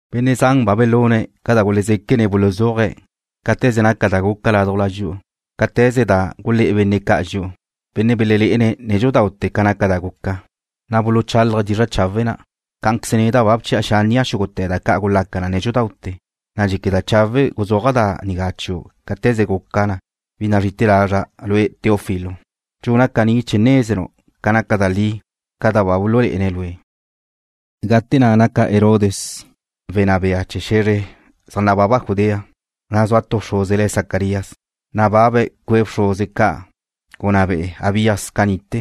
Benne' zan ba belune̱' ca da gulezéquene̱' buluzúaje̱' cáte̱ze naca da guca ládujla dxi'u, cáte̱ze na' gulé̱ benne' ca', benne' belelé'ene̱' nédxudaute̱ ca naca da guca na, na' buluchálaje̱' dizra' chawe' na'. Cá'anqueze neda' ba bchi'a xánnia' xúgute̱ da ca' gulaca na nédxudaute̱, na' dxéqueda' chawe' guzúaja' da nigá chiu' cáte̱ze guca, bi nazrí'ite̱ lazra', lue', Teófilo. Dxuna' caní chee̱ nézenu' naca na da li ca da ba bululé'ene̱' lue'. Gate na' naca Herodes wenná bea chee̱ xe̱zre ca' zaj nababa Judea, na' zua tu bxruze le̱' Zacarías, benne' nababe̱' cue' bxruze ca' gunná be'e Abías ca ni'te.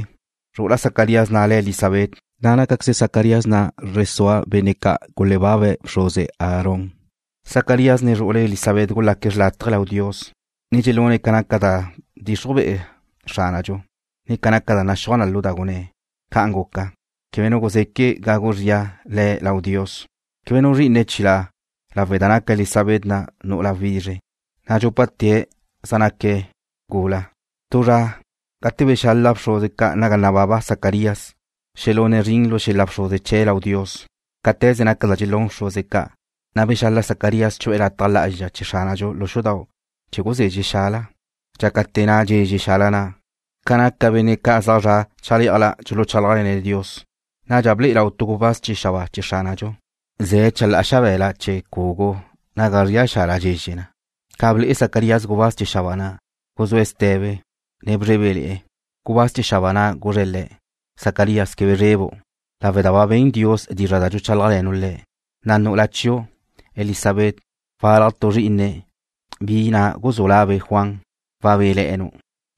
Zru'ula Zacarías na' le̱' Elisabet, na' nácaqueze Zacarías na' zre sua benne' ca' gulebábale̱ bxruze Aarón. Zacarías ne zru'ule̱' Elisabet gulaque̱' xrlátaje lau Dios, ne dxelune̱' ca zaj naca da bdxixruj bea Xránadxu, ne ca da naxúaj na lu da gunné̱'. Ca'an guca, quebe nu guzeque gagu zria le̱' lau Dios. Quebe nu zrí'ine̱' chilá', lawe' da naca Elisabet na' nu'ula wizre, na' dxúpate̱' zaj bezúale̱'e̱ gula. Tu zra, gate belexala bxruze ca' naga nababa Zacarías xelune̱' zrin lu xel-la bxruze chee̱' lau Dios, cáte̱ze naca da dxelún bxruze ca', na' bexala Zacarías chu'e̱ lu lataj lá'azxa chee̱ Xránadxu lu xudau' chee̱ guzezxe̱' xala. Dxácate̱ na' dxezxe xala na', ca naca benne' ca' zaj zra' chalé'ajla dxuluchálajle̱ne̱' Dios. Nadxa ble'e lau tu gubáz chee̱ xabáa chee̱ Xránadxu, ze̱' chalá'a xabe̱la chee̱ cugu naga zría xala dxezxe na. Ca ble'e Zacarías gubáz chee̱ xabáa na', guzúe̱' ste̱be, ne bzrébele̱'e̱. Gubáz chee̱ xabáa na' guzre̱' le̱': ―Zacarías, quebe zrebu', lawe' da ba ben Dios dizra' da dxuchálajle̱nu' Le̱', na' nu'ula chiu', Elisabet, walaj tu zri'ine̱', bi na' guzú' labe' Juan. Wabéle̱'e̱nu',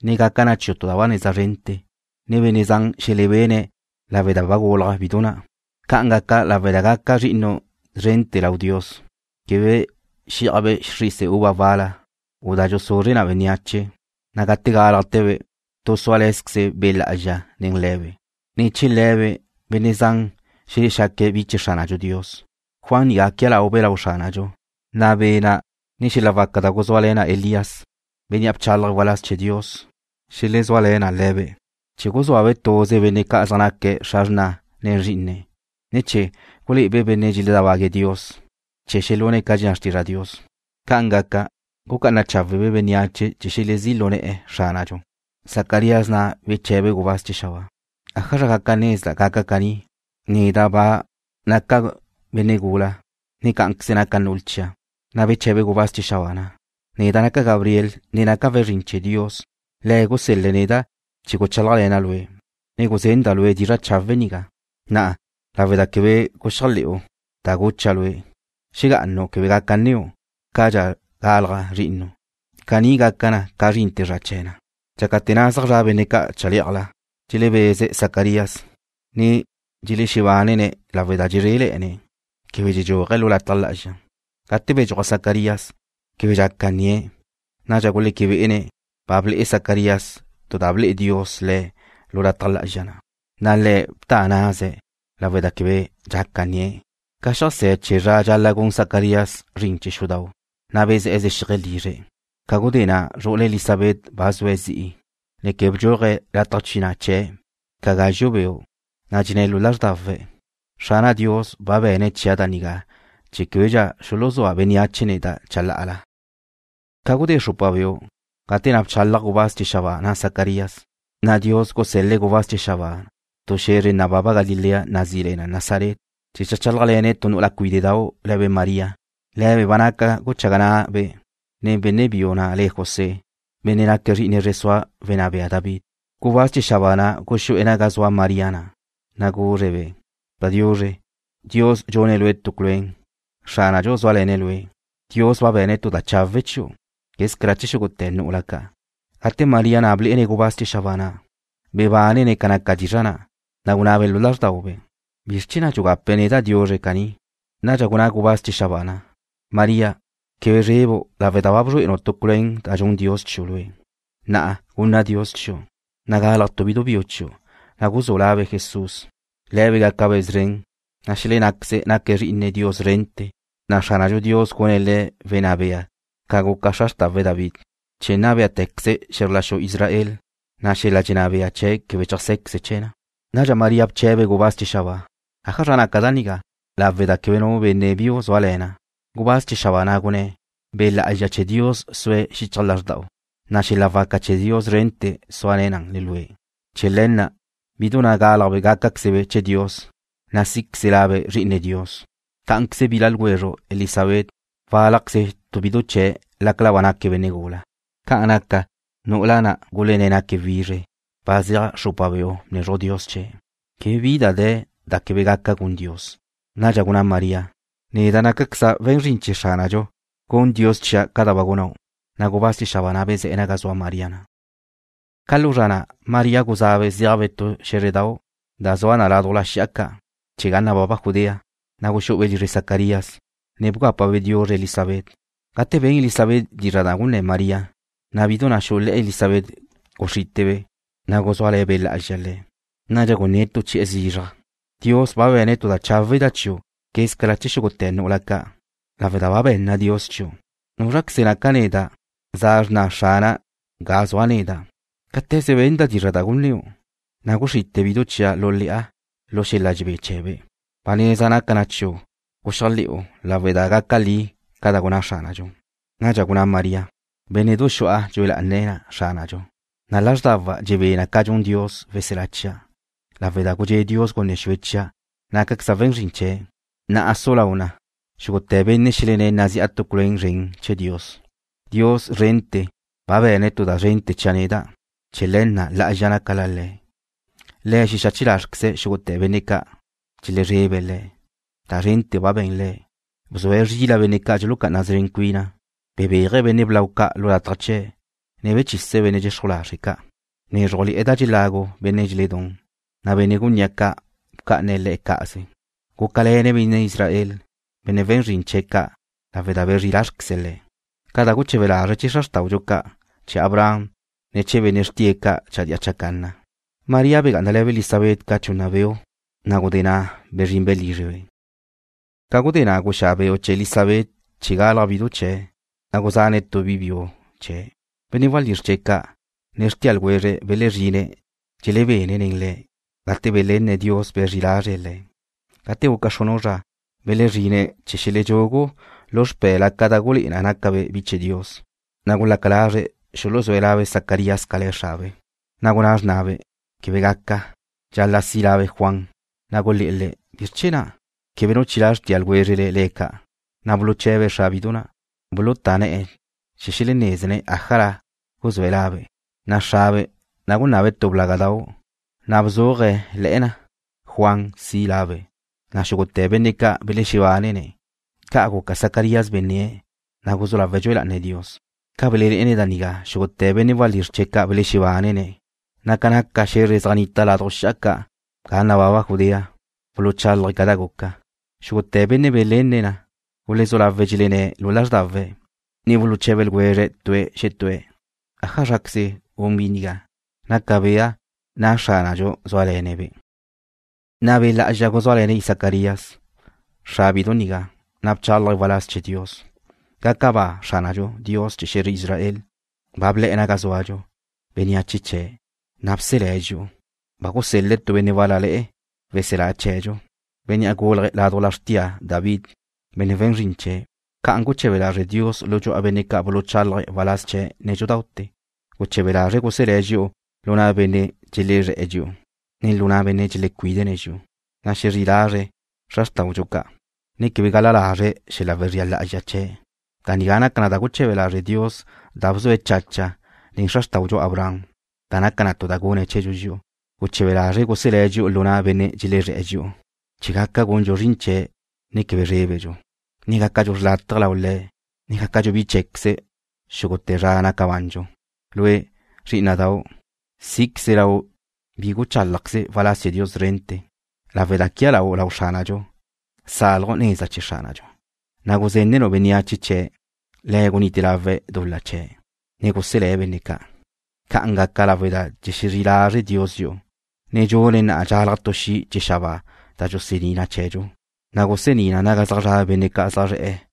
ne gaca chiu' tu da ba neza zrente̱, na' benne' zan xelebene̱' lawe' da ba gulaj bidu na'. Ca'an gaca lawe' da gaca zri'inu' szrente̱ lau Dios. Quebe xí'ajbe' xrise uva wal-la, u da dxusuzre na bénneache, na' gate gálajte̱be' tu súale̱zqueze Be' Lá'azxa nen le̱be'. Ne̱ chee̱ le̱be' benne' zan xelexaque̱' bi chee̱ Xránadxu Dios. Juan nigá quia laube' lau Xránadxu, na' Be' na', ne xel-la waca da gulezúale̱ na Elías, bénnea' bchálaje̱' waláz chee̱ Dios gate nate, xelezúale̱ na le̱be', chee̱ guzúabe' tuze benne' ca' zaj naque̱' xra xrna nen zrí'ine̱', ne chee̱ gulé'ebe' benne' dxeledábague̱' Dios chee̱ xelune̱' ca dxenná xrtizra' Dios. Ca'an gaca, gucá'ana cháwebe' bénneache chee̱ xelezí' lu ne̱'e̱ Xránadxu. Zacarías na' bche̱be̱' gubáz chee̱ xabáa: ―¿Ájazra gaca nezda' gaca caní? Neda' ba nagúlale̱'a, ne cá'anqueze naca nu'ula chia'. Na' beche̱be gubáz chee̱ xabáa na': ―Neda' naca' Gabriel, ne naca' we̱n zrin chee̱ Dios. Le̱' gusel-le̱' neda' chee̱ guchálajle̱na' lue', ne guzenda' lue' dizra' chawe' nigá. Na'a, lawe' da quebe guxéajle̱'u da gucha' lue', xegá'anu' quebe gaca nníu' cadxa galaj zri'inu'. Caní gaca na ca zrinte̱ zra chee̱ na. Dxácate̱ na' zaj zra' benne' ca' chalé'ajla, dxelebeze̱' Zacarías, ne dxelexebánene̱' lawe' da dxezréle̱'e̱ne̱', quebe dxedxúaje̱' lu lataj lá'azxa. Gate bedxúaj Zacarías, québedxa dxaca nnie̱'. Nadxa guleque bé'ene̱' ba ble'e Zacarías tu da ble'e Dios le̱' lu lataj lá'azxa na'. Na' le̱' bta ná'ase̱', lawe' da quebe dxaca nnie̱'. Ca xeajsé̱ chee̱ zra ca' dxal-la' gun Zacarías zrin chee̱ xudau', na' bezé̱'e̱ zexíaje̱' lizre̱'. Ca gudé na' zru'ule̱' Elisabet ba zue̱' zi'i, na' quebe bdxúaje̱' lataj bchina' chie̱' ca gazxu' beu', na' dxenné̱' lu lázrdawe̱': “Xrana' Dios ba be̱ne̱' chia' da nigá chee̱ québedxa xuluzúa bénneache neda' chalá'ala.” Ca gudé xrupa beu' gate na' bchálajle̱ gubáz chee̱ xabáa na' Zacarías, na' Dios gusel-le̱' le̱' tu xe̱zre nababa Galilea nazí le na Nazaret, chee̱ cheajchálajle̱ne̱' tu nu'ula cuíde'dau' le̱be' María. Le̱be' ba zua guchaga na'be' benne' biu na' le̱' José, benne' naque̱' zri'ine zre sua wenná bea David. Gubáz chee̱ xabáa na' guxú'e̱ naga zua María na', na' guzre̱'-be': ―Padiuzre. Dios dxune̱' lue' tu culuén. Xránadxu zúale̱ne̱' lue'. Dios ba be̱ne̱' tu da cháwedxa chiu' quézcala chee̱ xúgute̱ nu'ula ca'. Gate María na' ble'ebe' gubáz chee̱ xabáa na', bebánebe' ca naca dizra' na', na' gunabe' lu lázrdaube': ¿Bizr chee̱ na' dxugape̱' neda' diuzre caní? Nadxa gunná gubáz chee̱ xabáa na': ―María, quebe zrebu' lawe' da ba bzrué'enu' tu culuén da dxun Dios chiu' lue'. Na'a, zua da gunna Dios chiu', na' galaj tu bidu biu chiu', na' guzú' labe' Jesús. Le̱be' gácabe' szren, na' xelennáqueze̱' naque̱' Zri'ine Dios szrente̱, na' Xránadxu Dios gune̱' Le̱' wenná bea ca guca xra xrtawe̱' David, chee̱ nna bé'etecaze̱' xe̱zr la xu Israel, na' xel-la dxenná bea chee̱' quebe cheajsé̱queze chee̱ na. Nadxa María bché̱bebe' gubáz chee̱ xabáa: ―¿Ájazra gaca da nigá, lawe' da quebe nu benne' biu zúale̱na'? Gubáz chee̱ xabáa na' gunné̱': ―Be' Lá'azxa chee̱ Dios sue̱' xichaj lázrda'u, na' xel-la waca chee̱ Dios szrente̱ sua na nen lue'. Chee̱ le̱ na' bidu na' gálajbe' gácaquezebe' chee̱ Dios, na' sí'queze labe' Zri'ine Dios. Cá'anqueze bila ljwezru' Elisabet wálajqueze bidu chee̱' lácala ba naque̱' benne' gula. Ca'an naca, nu'ula na' gulenné̱' naque̱' wizre, ba zeaj xrupa beu' bnezruj Dios chee̱'. Quebe bi de̱ da quebe gaca gun Dios. Nadxa gunná María: ―Neda' nácaqueza' we̱n zrin chee̱ Xránadxu. Gun Dios chia' ca da ba gunnáu'. Na' gubáz chee̱ xabáa na' bezé̱'e̱ naga zua María na'. Ca lu zra na' María guzá'abe' zéajbe' tu xé̱zredau' da zua na laduj xi'a ca' chee̱ ga nababa Judea. Na' guxú'ube' lizre Zacarías, ne bgápabe' diuzre Elisabet. Gate ben Elisabet dizra' da gunné̱ María, na' bidu na' xú'ube' le̱'e Elisabet guxrítebe', na' guzúale̱ Be' Lá'azxa le̱'. Nadxa gunné̱' tu chi'e̱ zizraj: ―Dios ba be̱ne̱' tu da cháwedxa chiu' quézcala chee̱ xúgute̱ nu'ula ca', lawe' da ba zua da be̱nna Dios chiu'. ¿Núzraqueze naca' neda', za xrna Xrana' ga zua' neda'? Cáte̱ze benda' dizra' da gunnéu', na' guxrite bidu chia' lu le̱'a lu xel-la dxebé chee̱be'. Ba neza naca na chiu' guxéajle̱'u lawe' da gaca li ca da gunná Xránadxu. Nadxa gunná María: Bénne'du xu'a dxue lá'ana na Xrana'. Lázrdawa' dxebé na ca dxun Dios, weselá chia'. Lawe' da gudxé' Dios gunne xue chia', nácaqueza' we̱n zrin chee̱'. Na'a su lau na, xúgute̱ benne' xelenné̱' nazi'a tu culuen zren chee̱ Dios. Dios Szrente̱ ba be̱ne̱' tu da zrente̱ chia' neda'. Chee̱ le̱ na' lá'azxa naca La Le̱'. Le̱' xexache lázrqueze̱' xúgute̱ benne' ca' dxelezrebe̱' Le̱'. Da zrente̱ ba be̱n Le̱'. Bzue̱' zrila benne' ca' dxulucá'ana szren cuine̱'. Bebéaje̱' benne' blau ca' lu lataj chee̱', ne bechise̱' benne' dxexruj lazre' ca'. Bnézrujle̱'e̱ da gulagu benne' dxeledún, na' benne' gunní'a ca' bca'ane̱' le̱' cá'aze. Gúcale̱ne̱' benne' Israel, benne' we̱n zrin chee̱' ca' lawe' da bezrí lázrqueze̱' le̱', ca da guche̱be lazre̱' chee̱ xra xrtáudxu ca', chee̱ Abraham, ne chee̱ benne' xrtie̱' ca' chadía chacanna. María begá'anale̱be' Elisabet ca chunna beu', na' ca gudé na' bezrinbe' lízrebe'. Ca gudé na' guxá' beu' chee̱ Elisabet na' chee̱ galaj bidu chee̱', na' guzane̱' tu bi biu chee̱'. Benne' walízr chee̱' ca', ne xrtia ljwezre̱' belezrine̱' dxelebene̱' nen le̱', gate belenne̱' Dios bezrí lázrele̱'e̱ le̱'. Gate guca xrunu' zra, belezrine̱' chee̱ xelechúgue̱' lu xpé̱labe' da gulé'e na naca be̱' bi chee̱ Dios, na' gulaca lazre̱' xuluzúe̱' labe' Zacarías ca le̱ xrabe'. Na' gunná xrnabe': ―Quebe gaca. Dxal-la' si' labe' Juan. Na' gulé̱'e̱ le̱': ―¿Bizr chee̱ na'? Quebe nu chilá' xrtia ljwézrele le̱' ca'. Na' buluche̱be̱' xra bidu na', bulutá ne̱'e̱ chee̱ xelenézene̱' ájazra guzúe̱' labe'. Na' xrabe' na' gunabe̱' tu blágadau', na' bzuaje̱' le̱'e̱ na: Juan si' labe'. Na' xúgute̱ benne' ca' belexebánene̱'. Ca' guca Zacarías benné̱', na' guzú lawe̱' dxue lá'ane̱' Dios. Ca belelé'ene̱' da nigá, xúgute̱ benne' walízr chee̱' belexebánene̱', na' ca naca xe̱zre zaj nnita laduj xi'a ca ga nababa Judea, buluchálaje̱' ca da guca. Xúgute̱ benne' belenne̱' na, gulezú lawe̱' dxelenné̱' lu lázrdawe̱', ne buluche̱be ljwezre̱' tue̱' xetúe̱': ―¿Ájazraqueze gun bi nigá? Naca bea na Xránadxu zúale̱ne̱'-be'. Na' Be' Lá'azxa guzúale̱ne̱' Zacarías, xra bidu nigá, na' bchálaje̱' waláz chee̱ Dios, gunné̱': ¡Gaca ba Xránadxu, Dios chee̱ xe̱zre Israel! Ba ble̱'e̱ naga zúadxu, bénneache chee̱', na' bselé̱' dxi'u. Ba gusel-le̱' tu benne' wál-lale̱'e̱, weselá chee̱dxu. Bénnea' gulaj ládujla xrtia David, benne' we̱n zrin chee̱'. Ca'an guche̱be lazre' Dios lu dxu'a benne' ca' buluchálaje̱' waláz chee̱' nédxudaute̱. Guche̱be lazre̱' guselé̱' dxi'u lu na' benne' dxelezré̱'e̱ dxi'u, ne lu na' benne' dxelecuídene̱' dxi'u. Xezrí lazre̱' xra xrtáudxu ca', ne quebe gal-la lazre̱' xel-la wezría lá'azxa chee̱'. Da nigá naca na da guche̱be lazre' Dios da bzua chache̱' nen xra xrtáudxu Abraham, da naca tu da gunne̱' chee̱dxu dxi'u. Guche̱be lazre̱' guselé̱' dxi'u lu na' benne' dxelezré̱'e̱ dxi'u chee̱ gaca gundxu zrin chee̱', ne quebe zrébedxu, ne gácadxu xrlátaje lau Le̱', ne gácadxu bi cheé̱queze̱' xúgute̱ zra naca bandxu. Lue', zrí'ina'dau', sí'queze lau' bi guchálajqueze waláz chee̱ Dios szrente̱, lawe' da quia lau' lau Xránadxu, salju' neza chee̱ Xránadxu, Guzénenu' bénneache chee̱', Le̱' gunite lawe̱' dul-la chee̱', ne guselé̱' benne' ca'. Ca'an gaca lawe' da dxexezrí lazre' Dios dxi'u. Dxune̱' na'a dxalaj tu xi' chee̱ xabáa da dxusení' chee̱dxu, na' gusení na naga zaj zra' benne' zaj zre̱'e̱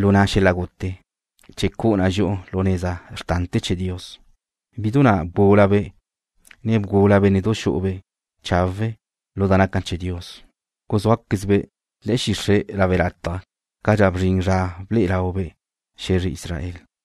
lu na' xel-la gute, chee̱ cu'u na dxi'u lu neza xrtante̱ lau Dios. Bidu na' bgúlabe', ne bgula bénne'du xu'ube' chawe' lu da naca chee̱ Dios. Guzúaquezbe' le̱'e̱ xixre' lawe' lataj cadxa bzrin zra ble'e laube' xe̱zre Israel.